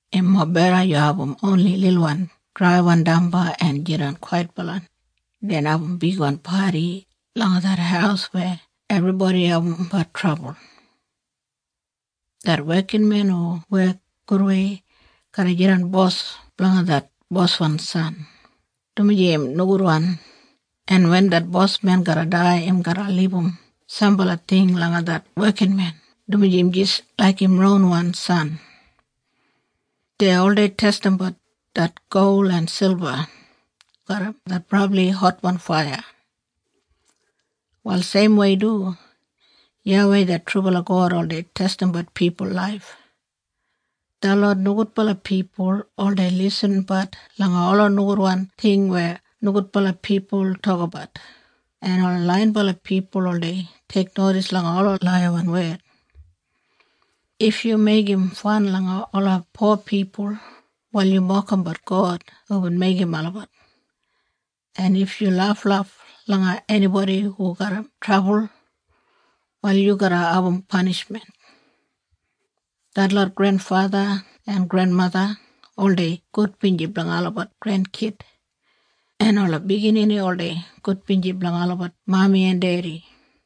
Im mobeda yu abum oni lilwan draiwan damba en jidan kwaitbala, den abum bigwan padi langa det haus weya ebribodi abumbat trabul. Det wekinmen hu wek gudwei garra jidan bos blanga det boswan san, dumaji im nogudwan, en wen det bosmen garra dai im garra libum sambala ting langa det wekinmen dumaji im jis laik im ronwan san. Dei oldei testimbat det gol en silba garram det brabli hotwan faiya. Wal seimwei du YAWEI det trubala God oldei testimbat pipul laif. Detlot nogudbala pipul oldei lisinbat langa ola nogudwan ting weya nogudbala pipul tokabat, en ola laiyinbala pipul oldei teiknodis langa ola laiyawan wed. If yu meigim fan langa ola po pipul, wal yu mokimbat God hubin meigim olabat. En if yu laflaf langa enibodi hu garram trabul wal yu garra abum panishmen. Detlot grenfatha en grenmatha oldei gudbinji blanga olabat grenkid, en ola biginini oldei gudbinji blanga olabat mami en dedi.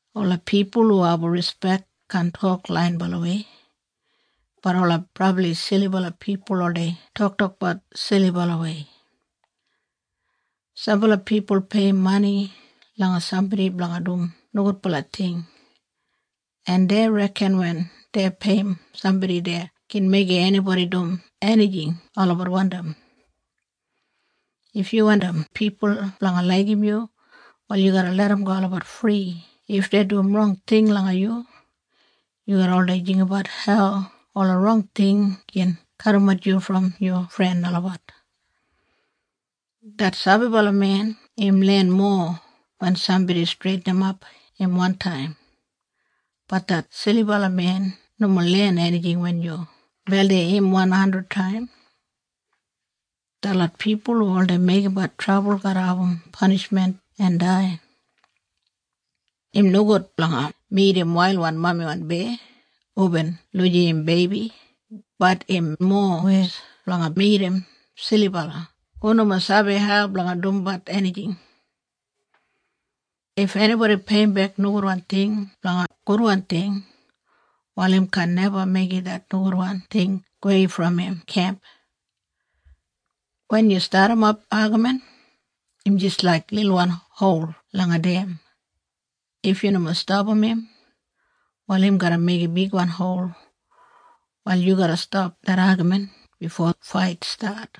Ola pipul hu abum rispek kaan tok laiyinbalawei, bat ola brabli silibala pipul oldei toktokbat silibalawei. Sambala pipul peiyim mani langa sambodi blanga dum nogudbala ting, en dei reken wen dei peiyim sambodi dei gin meigim enibodi dum enijing olabat wandim. If yu wandim pipul blanga laigim yu wal yu garra larramgo olabat fri if dei dum rong ting langa yu. Yu garra oldei jinggabat hau ola rong ting gin kadimat yu brom yu fren olabat. Det sabibala men im len mowa wen sambodi streitinimap im wantaim, bat det silibala men nomo len enijing wen yu beldim im wan handrid taim. Detlot pipul hu oldei meigimbat trabul garra abum panishmen en dai. Im nogud blanga midim wailwan mamiwan beya hubin lujim im beibi bat im mowes blanga midim silibala hu nomo sabi hau blanga dumbat enijing. If enibodi peiyimbek nogudwan ting blanga gudwan ting, wal im kaan neba meigim det nogudwan ting gowei brom im kemp. Wen yu stadimap agamin im jis laik lilwan hol langa dem, if yu nomo stapam im, wal im garra meigim bigwan hol. Wal yu garra stap det agamin bifo fait stat.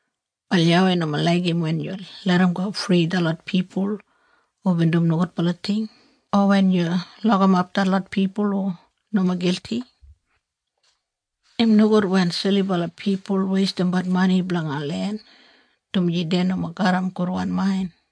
Wal YAWEI nomo laigim wen yu larramgo fri detlot pipul hubin dum nogudbala ting, o wen yu lokimap detlot pipul hu nomo gilti. Im nogud wen silibala pipul weistimbat mani blanga len, dumaji dei nomo garram gudwan main.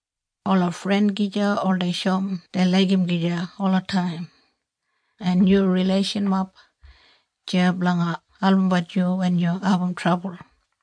Ola fren gija oldei shoum dei laigim gija olataim, en yu rileishanmob deya blanga albumbat yu wen yu abum trabul.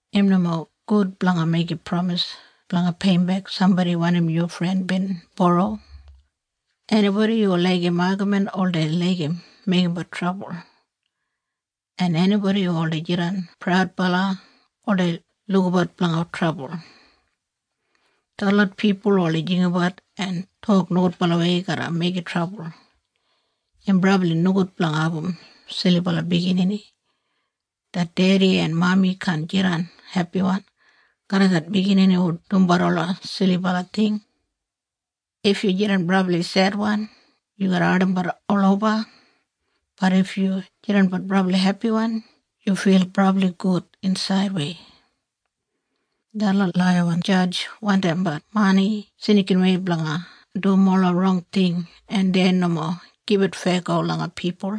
Im nomo gud blanga meigim pramis blanga peiyimbek sambodi wanim yu fren bin boro. Enibodi hu laigim agamin oldei laigim meigimbat trabul, en enibodi hu oldei jidan praudbala oldei lukabat blanga trabul. Detlot pipul hu oldei jinggabat en tok nogudbalawei garra meigim trabul. Im brabli nogud blanga abum silibala biginini. Det dedi en mami kaan jidan hepiwan garram det biginini hu dumbat ola silibala ting. If yu jidan brabli sedwan yu garra ardimbat oloba, bat if yu jidanbat brabli hepiwan yu fil brabli gud insaidwei. Detlot laiyawan jadj wandimbat mani snikinwei blanga dum ola rong ting en dei nomo gibit feyago langa pipul.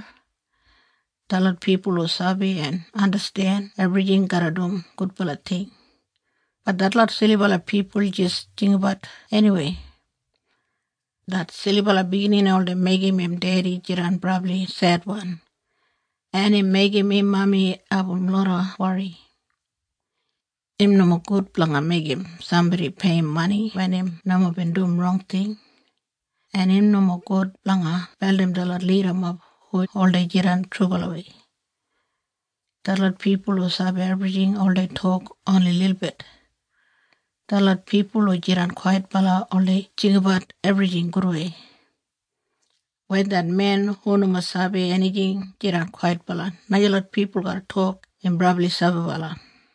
Detlot pipul hu sabi en andasten ebrijing garra dum gudbala ting, bat detlot silibala pipul jis jinggabat eniwei. Det silibala biginini oldei meigim im dedi jidan brabli sedwan, en im meigim im mami abum loda wori. Im nomo gud blanga meigim sambodi peiyim mani wen im nomo bin dum rong ting, en im nomo gud blanga beldim detlot lidamob hu oldei jidan trubalawei. Detlot pipul hu sabi ebrijing oldei tok oni lilbit. Detlot pipul hu jidan kwaitbala oldei jinggabat ebrijing gudwei. Wen det men hu nomo sabi enijing jidan kwaitbala najalot pipul garra tok im brabli sabibala.